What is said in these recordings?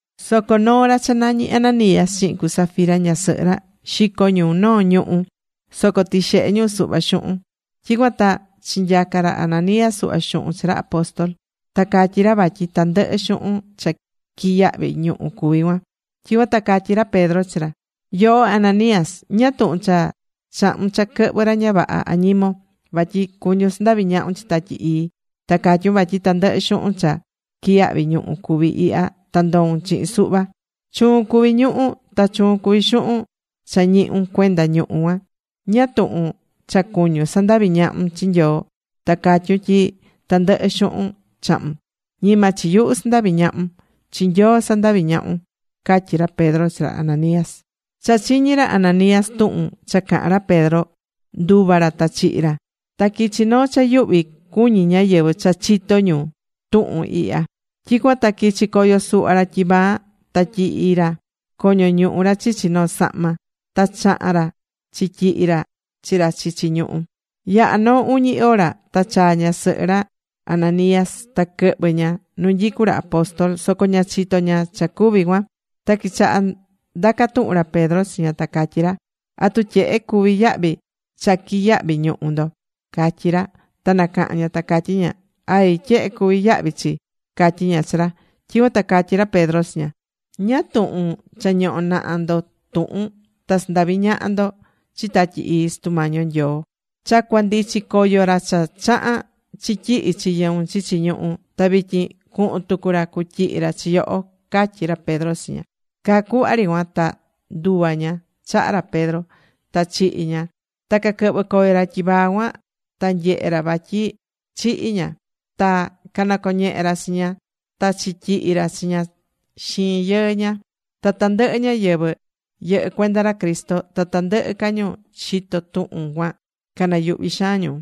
Soco noo ra cha nañí Ananías chihin cu Safira ñasɨhɨ ra, xico̱ ñu noo ñuhú. Soco tixehe ñu suhva xuhun. Tyicuan ta chinyaca̱ ra Ananías suhva xuhun chi ra apóstol. Ta catyí ra vatyi tandɨhɨ xuhun cha quiyahvi̱ ñuhú cuví cuan. Tyicuan ta catyí ra Pedro chi ra: ―Yoho Ananías, ¿ñáá tuhun cha chahu̱n cha quɨhvɨ ra ña vaha añimon, vatyi cuñún sandavi ñahun chi Tatyi Ii, ta catyún vatyi tandɨhɨ xuhun cha quiyahvi ñuhu cuví ihya ta ndoún chihin suhva? Chuun cuvi̱ ñuhú, ta chuun cuví xuhun cha ñihu̱n cuenda ñuhú cuan. ¿Ñáá tuhun cha cuñún sandavi ñahun chi Nyoo ta catyún tyi tandɨhɨ xuhun chahu̱n? Ñima chi nyuhu sandaví ñahun, chi Nyoo sandaví ñahun ―catyi ra Pedro chi ra Ananías. Cha chiñi̱ ra Ananías tuhun cha caha̱n ra Pedro, nduva̱ ra ta chihi̱ ra. Ta quichi noo cha yuhvi cuñí ñáyɨvɨ cha chito̱ ñu tuhun ihya. Tyicuan ta quichi̱ coyo suhva ra tyivaa ta tyihi̱ ra coño ñuhu ra chichi noo sahma. Ta chaha̱n ra chityihi̱ ra chi ra chichi ñuhú. Yaha̱ noo uñi hora ta chaa̱ ñasɨhɨ ra Ananías ta quɨhvɨ̱ ña nu nyicú ra apóstol. Soco ña chitó ña cha cuvi̱ cuan. Ta quichaha̱ ndaca tuhun ra Pedro chi ña ta catyí ra: ―¿Atu tyehe cuví yahvi cha quiyahvi̱ ñuhú ndo? ―catyí ra. Ta nacaha̱n ña ta catyí ña: ―Ay, tyehe cuví yahvi chi ―catyí ña chi ra. Tyicuan ta catyí ra Pedro chi ña: ―¿Ñáá tuhun cha ñoho̱ naha ndo tuhun ta sandavi ñaha ndo chi Tatyi Ii Sutu Mañi yo Nyoo? Cha cuandichi coyo ra cha chaha̱n chityihi chi yɨun chichi ñuhú. Ta vityin cuhun tucu ra cutyihi ra chi yoho ―catyí ra Pedro chi ña. Caa cuhva ri cuan ta nduva̱ ña chaha ra Pedro, ta chihi̱ ña. Ta caquɨhvɨ̱ coyo ra tyivaa cuan, ta nyehe̱ ra vatyi chihi̱ ña. Ta canacoñehe̱ ra chi ña ta chityihi ra chi ña xiin yɨɨ ña. Ta tandɨhɨ ñáyɨvɨ yɨhɨ́ cuenda ra Cristo, ta tandɨhɨ ca ñu chitó tuhun cuan, canayuhvi xaan ñu.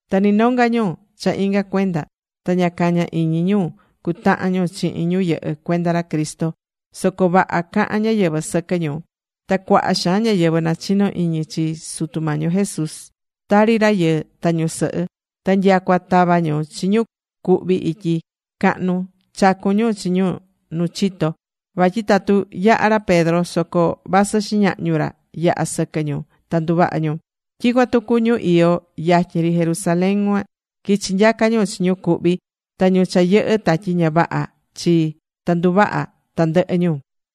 Ta ni nonga ñu cha inga cuenda ta ña cañá iñi ñu cutahan ñu chihin ñu yɨhɨ́ cuenda ra Cristo. Soco vaha cahán ñáyɨvɨ sɨquɨ ñu. Ta cuaha xaan ñáyɨvɨ nachinó iñi chi Sutu Mañi yo Jesús, tari rayɨɨ ta ñusɨhɨ. Ta nyacua tavá ñu chi ñu cuhví ityi cahnu, chacún ñu chi ñu nu chito. Vatyi tatu yaha ra Pedro soco vasɨ xiñahñu ra yaha sɨquɨ ñu, ta nduvaha ñu. Tyicuan tucu ñu iyó yatyin ri Jerusalén cuan, quichí nyaca ñu chi ñu cuhví ta ñu cha yɨhɨ́ tatyi ña vaha chi. Ta nduvaha̱ tandɨhɨ ñu.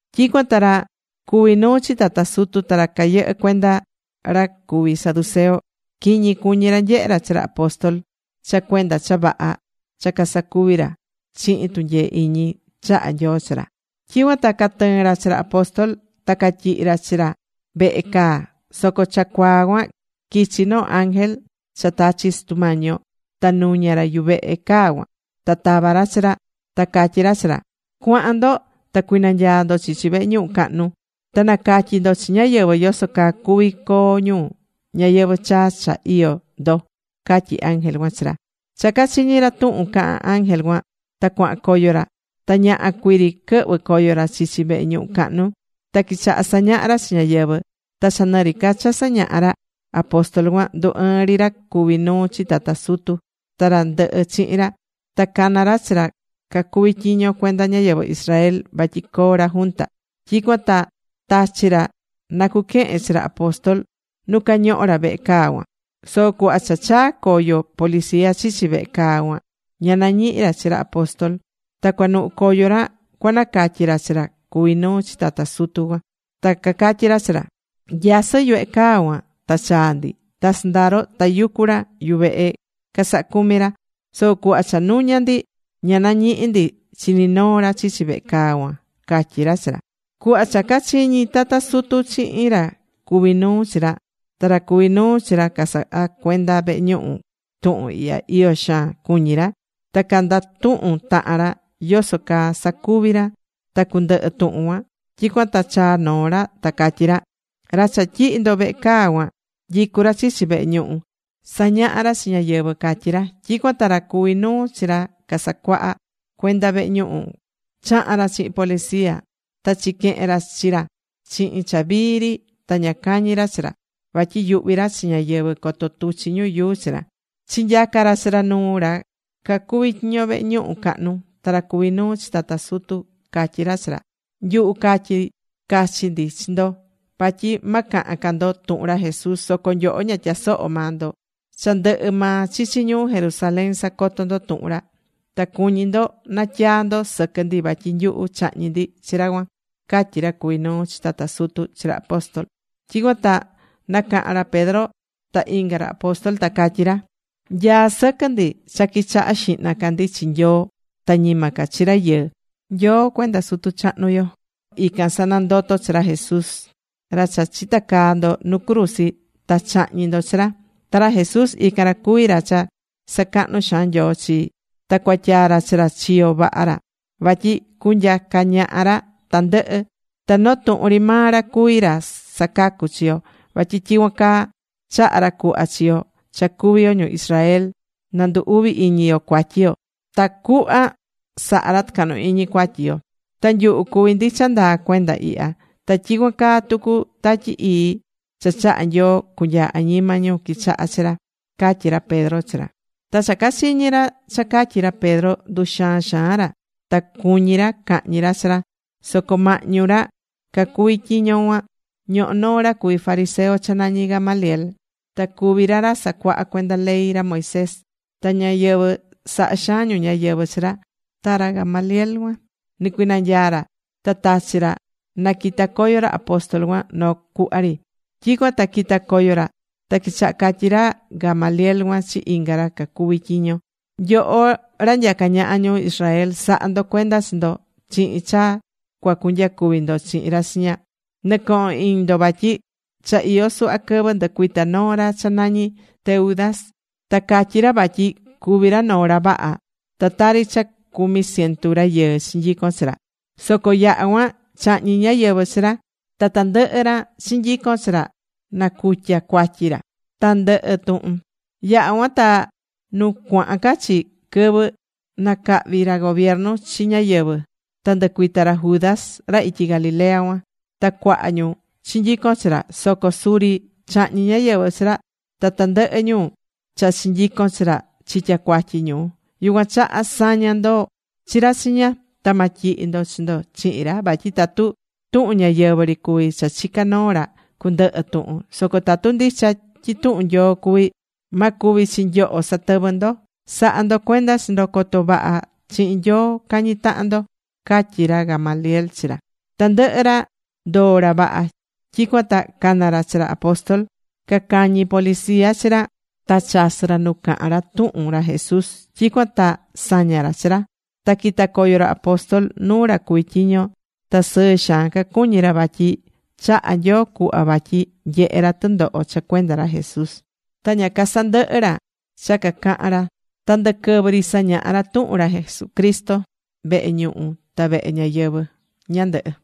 Tyicuan ta ra cuví nuu chi tata sutu, ta ra cayɨhɨ́ cuenda ra cuví saduceo, quiñi cuñi ra nyehe ra chi ra apóstol cha cuenda cha vaha cha casacuví ra chihin tunyee iñi chahá Nyoo chi ra. Tyicuan ta catɨɨ̱n ra chi ra apóstol. Ta catyihi̱ ra chi ra vehe caa. Soco cha cuaa cuan quichi̱ noo ángel cha tachi Sutu Mañi yo, ta nuña̱ ra yuvehe caa cuan. Ta tava̱ ra chi ra. Ta catyi̱ ra chi ra: ―Cua̱han ndo ta cui̱nanyaa ndo chichi vehe ñuhu cahnu. Ta na̱catyi ndo chi ñáyɨvɨ yoso caa cuvi coo ñu ñayɨvɨ̱ chaa cha iyó ndo ―catyí ángel cuan chi ra. Cha cachiñi̱ ra tuhun caha̱n ángel cuan, ta cuahan coyo ra. Ta ñaha cuii ri quɨhvɨ̱ coyo ra chichi vehe ñuhu cahnu. Ta quichaha̱ sañaha ra chi ñáyɨvɨ. Ta cha nɨ ri ca cha sañahá ra apóstol cuan, ndu ɨɨn ri ra cuví nuu chi tata sutu ta ra ndɨhɨ chihin ra. Ta cana̱ ra chi ra cacuví tyiño cuenda ñáyɨvɨ Israel vatyi coo ra junta. Tyicuan ta tachi̱ ra na cuquehen chi ra apóstol nu cañohó ra vehe caa cuan. Soco cuhva cha chaa̱ coyo policia chichi vehe caa cuan, ña nañihi̱ ra chi ra apóstol. Ta cuanuhu coyo ra cuanacatyi ra chi ra cuví nuu chi tata sutu. Ta cacatyí ra chi ra: ―Nyasɨ yuvehe caa cuan ta chaa̱ ndi. Ta sɨndaro, tayucú ra yuvehe casahá cumi ra. Soco cuhva cha nuña̱ ndi, ña nañihi̱ ndi chi ni noo ra chichi vehe caa cuan ―catyí ra chi ra. Cuhva cha cachiñi̱ tata sutu chihin ra cuví nuu chi ra, ta ra cuví nuu chi ra casaha cuenda vehe ñuhu tuhun ihya, iyo xaan cuñí ra. Ta candatuhun tahan ra yoso caa sacuvi ra ta cundɨhɨ tuhun cuan. Tyicuan ta chaa̱ noo ra ta catyí ra: ―Ra cha tyihi̱ ndo vehe caa cuan, nyicú ra chichi vehe ñuhu sañahá ra chi ñáyɨvɨ ―catyí ra. Tyicuan ta ra cuví nuu chi ra casahá cuenda vehe ñuhu, chaha̱n ra chihin policia, ta chiquehen ra chi ra chihin cha vii ri ta ña cañi̱ ra chi ra, vatyi yuhví ra chi ñáyɨvɨ coto tuchi ñu yuu chi ra. Chinyaca̱ ra chi ra nuu ra cacuvi tyiño vehe ñuhu cahnu. Ta ra cuví nuu chi tata sutu catyí ra chi ra: ―Nyuhu catyi̱ cachi ndi chi ndo vatyi ma cahan ca ndo tuhun ra Jesús. Soco nyoho ña tyasohó maa ndo. Cha ndɨhɨ maa chichi ñuu Jerusalén sacotó ndo tuhun ra. Ta cuñí ndo natyaa ndo sɨquɨ ndi vatyi nyuhu chahñi̱ ndi chi ra cuan ―catyí ra cuví nuu chi tata sutu chi ra apóstol. Tyicuan ta nacaha̱n ra Pedro ta inga ra apóstol, ta catyí ra: ―Nyaá sɨquɨ ndi cha quichaha xihna ca ndi chi Nyoo ta ñima ca chi rayɨɨ. Nyoo cuenda sutu chahnu yo ican sanandoto̱ chi ra Jesús, ra cha chitacaa̱ ndo nu cruzi ta chahñi̱ ndo chi ra. Ta ra Jesús ican ra cuví ra cha sacahnu̱ xaan Nyoo chi, ta cuatyaa̱ ra chi ra chiyo vaha ra, vatyi cunyaca ñaha ra tandɨhɨ. Ta noo tuhun ri maa ra cuví ra sacacú chi yo. Vatyi tyicuan caa chahá ra cuhva chi yo cha cuví yo ñu Israel na ndu uvi iñi yo cuatyi yo tacuhva saha ra tɨcahnu iñi cuatyi yo. Ta nyuhu cuví ndi cha ndaa cuenda ihya. Ta tyicuan caa tucu Tatyi Ii cha chaha̱ Nyoo cunyaa añima ñu quichahá chi ra ―catyi ra Pedro chi ra. Ta cha cachiñi̱ ra cha catyi̱ ra Pedro, nduxaan xaan ra. Ta cuñi̱ ra cahñi ra chi ra. Soco mahñu ra cacuví tyiño cuan ñohó noo ra cuví fariseo cha nañi Gamaliel. Ta cuví ra ra sacuahá cuenda ley ra Moisés. Ta ñáyɨvɨ sahá xaan ñu ñáyɨvɨ chi ra. Ta ra Gamaliel cuan, nicuinanyaa̱ ra. Ta tachi̱ ra naquita coyo ra apóstol cuan noo cuhva ri. Tyicuan ta quita coyo ra. Ta quichaha̱ catyi ra Gamaliel cuan chi inga ra cacuví tyiño: ―Nyoho ra nyacá ñaha ñu Israel, sa̱ha ndo cuenda chi ndo chihin cha cua cunyacuvi ndo chihin ra chiña. Nɨ̱cohon iñi ndo vatyi cha iyó suhva quɨvɨ ndɨcuita̱ noo ra cha nañi̱ Teudas. Ta catyi̱ ra vatyi cuví ra noo ra vaha. Ta tari cha cumi cientu rayɨɨ chinyicon chi ra. Soco yaha̱ cuan chahñi̱ ñáyɨvɨ chi ra. Ta tandɨhɨ ra chinyico̱n chi ra nacutya̱ cuatyi ra. Ta ndɨhɨ̱ tuhun. Yaha̱ cuan ta nu cuahan ca chi, quɨvɨ nacahvi ra gobiernu chi ñáyɨvɨ, ta ndɨcuita ra Judas ra ityi Galilea cuan. Ta cuaha ñu chinyico̱n chi ra. Soco suri chahñi̱ ñáyɨvɨ chi ra. Ta tandɨhɨ ñu cha chinyico̱n chi ra chitya̱ cuatyi ñu. Yucuan chaha sa̱ña ndo chi ra chiña. Ta ma tyihi ndo chi ndo chihin ra vatyi tatu tuhun ñáyɨvɨ ri cuví cha chicá noo ra, cundɨhɨ tuhun. Soco tatu ndicha tyi tuhun Nyoo cuví, ma cuvi chi nyoho satɨvɨ ndo. Sa̱ha ndo cuenda chi ndo coto vaha chihin Nyoo cañí tahan ndo ―catyí ra Gamaliel chi ra. Tandɨhɨ ra ndoo̱ ra vaha. Tyicuan ta cana̱ ra chi ra apóstol. Cacañi̱ policia chi ra. Ta chasɨ̱ ra nu cahan ca ra tuhun ra Jesús. Tyicuan ta saña̱ ra chi ra. Ta quita̱ coyo ra apóstol nuu ra cuví tyiño. Ta sɨɨ xaan cacuñí ra vatyi chaha̱ Nyoo cuhva vatyi nyehé ra tɨndoho cha cuenda ra Jesús. Ta ña casandɨhɨ̱ ra cha cacahán ra. Ta ndɨquɨvɨ ri sañahá ra tuhun ra Jesucristo vehe ñuhu ta vehe ñáyɨvɨ ñandɨhɨ.